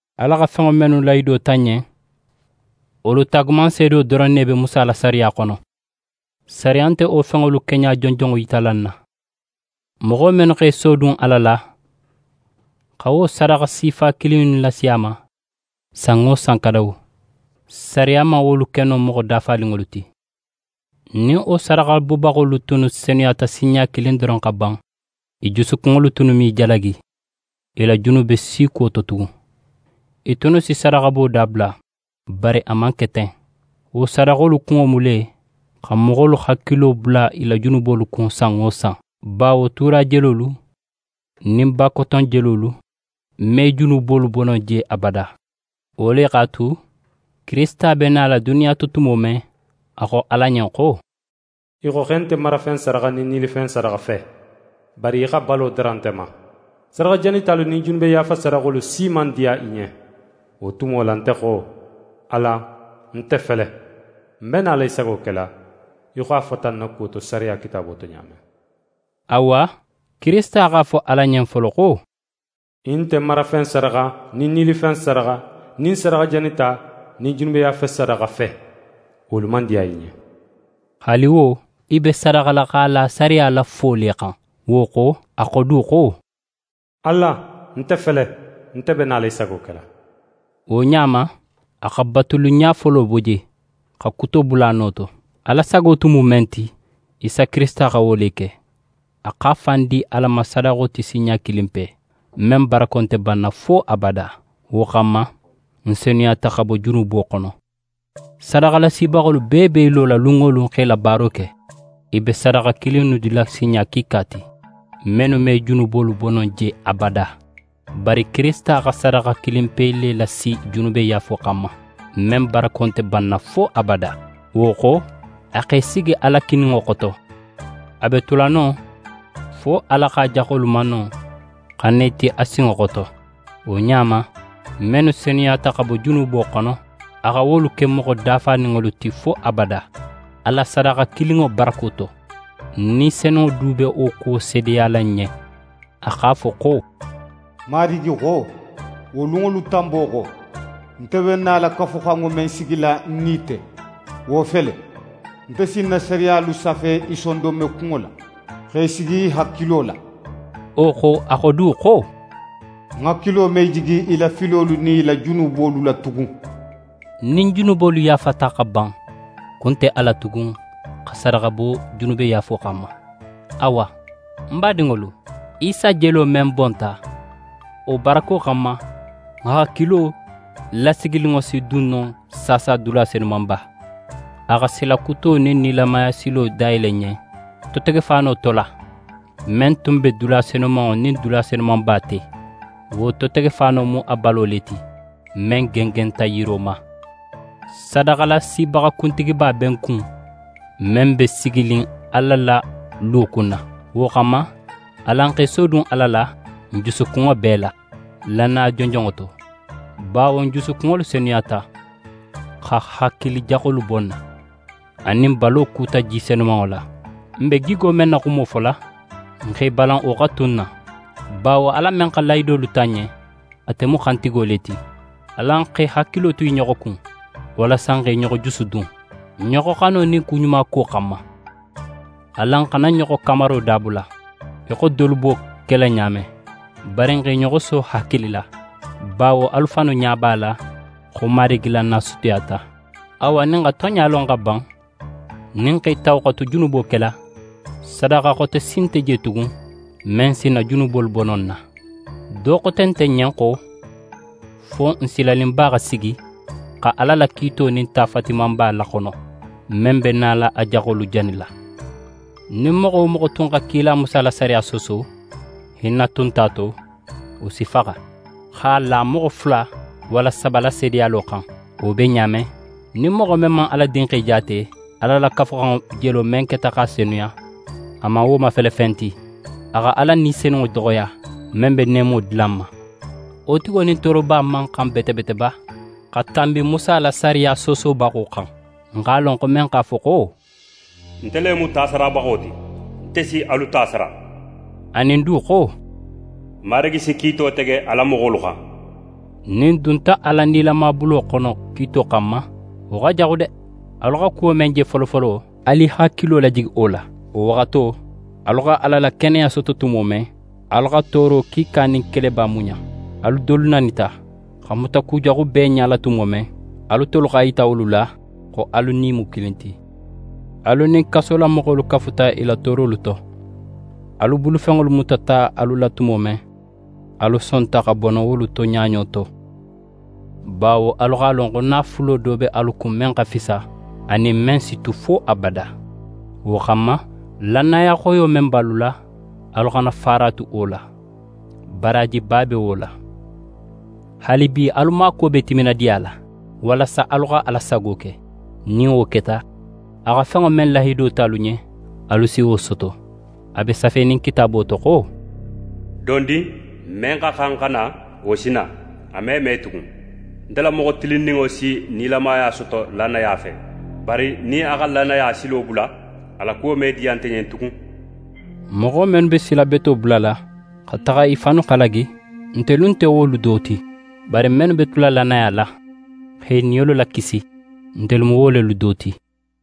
Ala xa fenŋo mennu lahido ta n ɲen, wolu taagumanseedo doron ne be Musa la sariya xono. Sariya nte wo fenŋolu keɲa jonjonŋo yitala n na. Moxo mennu x'e sodun Ala la, xa wo sadaxa sifa kilin innu lasi a ma san wo san kadawu, sariya man wolu ke no moxo dafaninŋolu ti. Nin wo sadaxabobaxolu tunnu senuyata sinɲa kilin doron xa ban, i jusukunŋolu tunnu me i jalagi i la junube si kuwo to tugun. I tunnu si sadaxabo dabula. Bari a man ke ten. Wo sadaxolu kunŋo mu le, xa moxolu hakilo bula i la junubolu kun san wo san. Bawo tuura jelolu nin bakoton jelolu me junubolu bo no je abada. Wo le x'a tu, Kirisita be nala duniya to tumo men, a xo Ala ɲen xo: «Í xo xo í nte marafen sadaxa nin nilifen sadaxa fe, bari í xa balo dara nte ma. Sadaxa janitalu nin junube yaafa sadaxolu si man diya í ɲen. Wo tumo la nte xo: “Ala, nte fele, ń be nala í sago kela, í xo a fota ń na kuwo to sariya kitaabo to ɲa men.”» Awa, Kirisita x'a fo Ala ɲen folo xo: «Í nte marafen sadaxa, nin nilifen sadaxa, nin sadaxa janita, nin junube yaafa sadaxa fe, wolu man diya í ɲen.» Haali wo, i be sadaxala x'a la sariya la fo le xan. Wo xo, a xo du xo: «Ala, nte fele, nte be nala í sago kela.» Wo ɲa ma, a xa batuliɲa folo bo je, xa kuto bula a no to. Ala sago tun mu men ti, Isa Kirisita xa wo le ke. A x'a fan di Ala ma sadaxo ti sinɲa kilinpe, men barako nte banna fo abada. Wo xanma, n senuyata xa bo junubo xono. Sadaxalasibaxolu bee be i lola lun wo lun xa i la baaro ke. I be sadaxa kilin innu dila sinɲa kiika ti, mennu me junubolu bo no je abada. Bari Kirisita xa sadaxa kilinpe le lasi junubeyaafo xanma, men barako nte banna fo abada. Wo xo, a x'é sigi Ala kininŋo xoto. A be tula non fo Ala x'a jaxolu mano xa na i ti a sinŋo xoto. Wo ɲa ma, mennu senuyata xa bo junubo xono, a xa wolu ke moxo dafaninŋolu ti fo abada, a la sadaxa kilinŋo barako to. Ni Senunŋo du be wo kuwo seedeyala n ɲen. A x'a fo xo: «Marigi xo: Wo lunŋolu tanbo xo, nte be nala Kafuxanŋo men sigila ń nin i te, wo fele: Nte si ń na sariyalu safe i sondonmekunŋo la, x'e sigi i hakilo la.» Wo xo, a xo du xo: «Ń hakilo me jigi i la filolu nin i la junubolu la tugun.» Nin junubolu yaafata xa ban, kun nte a la tugun xa sadaxa bo junubeyaafo xanma. Awa ń badinŋolu, Isa jelo men bonta, wo barako xanma, n hakilo lategeninŋo si dun no saasa dula Senumanba. A xa sila kuto nin nilamaya silo dayele n ɲen totegefaano to la, men tun be dula Senumanŋo nin dula Senumanba te. Wo totegefaano mu a balo le ti, men gengenta yiro ma. Sadaxalasibaxa kuntigiba be n kun, men be siginin Ala la luwo kunna. Wo xanma, alan x'e sodun Ala la n jusukunŋo bee la, lannaya jonjonŋo to. Bawo n jusukunŋolu senuyata, xa hakili jaxolu bo n na, anin n balo kuta ji senumanŋo la. N be gigo men na xumo fola, n x'e balan wo xa tu n na, bawo Ala men xa lahidolu ta n ɲen, ate mu xantigo le ti. Alan xa i hakilo tu i ɲoxo kun, walasa n xa i ɲoxo jusudun, ɲoxoxano nin kuɲumako xanma. Alan xana ɲoxo kamaro dabula, í xo dolu be wo kela ɲa men, bari n x'e ɲoxo so hakili la, bawo alu fannu ɲa b'a la xo Marigi la na sutiyata. Awa nin n xa tonɲa lon xa ban, nin n x'e tawu xa tu junubo kela, sadaxa xote si nte je tugun men si n na junubolu bo no n na. Do xote nte n ɲen xo, fo n silaninba xa sigi xa Ala la kiito nin ta fatimanba laxono, men be nala a jaxolu janila. Nin moxo wo moxo tun xa kila Musa la sariya sooso, hinna tun nte a to, wo si faxa x'a la moxo fula walla saba la seedeyalo xan. Wo be ɲa men, nin moxo men man Ala Dinxe jaate, Ala la Kafuxanŋo jelo men keta x'a senuya, a man wo mafele fen ti, a xa Ala Ni Senunŋo doxoya, men be neemo dila n ma. Wo tigo nin tooroba man xan bete bete ba xa tanbi Musa la sariya soosobaxo xan? N x'a lon xo men x'a fo xo: «Nte le mu tasarabaxo ti; nte si alu ta sara.» Anin du xo: «Marigi si kiito tege a la moxolu xan.» Nin n dunta Ala nilama bulo xono kiito xanma, wo xa jaxu de! Alu xa kuwo men je folofolo, alu i hakilo lajigi wo la. Wo waxato, alu xa Ala la keneya soto tumo men, alu xa tooro kiika nin keleba muɲa. Alu dolu nanita, xa mutakujaxu bee ɲala tumo men, alu tolu x'a yita wolu la xo alu nin i mu kilin ti. Alu nin kasolamoxolu kafuta i la toorolu to. Alu bulufenŋolu mutata alu la tumo men, alu sonta xa bono wolu to ɲaɲo to; bawo alu x'a lon xo naafulo do be alu kun men xa fisa, anin men si tu fo abada. Wo xanma, lannaya xoyo men be alu la, alu xana faaratu wo la. Baraajiba be wo la. Haalibi alu maakuwo be timinadiya la, walasa alu xa Ala sago ke. Nin wo keta, a xa fenŋo men lahido ta alu ɲen, alu si wo soto. A be safenin Kitaabo to xo: «Dondin, men xa xan xa na, wo si na. A me me tugun. Nte la moxo tilinninŋo si nilamaya soto lannaya fe. Bari nin a xa lannaya silo bula, a la kuwo me diya nte ɲen tugun.» Moxo mennu be sila beto bulala, xa taxa i fannu halagi, ntelu nte wolu do ti; bari mennu be tula lannaya la, xa i niyolu lakisi, ntelu mu wo lelu do ti.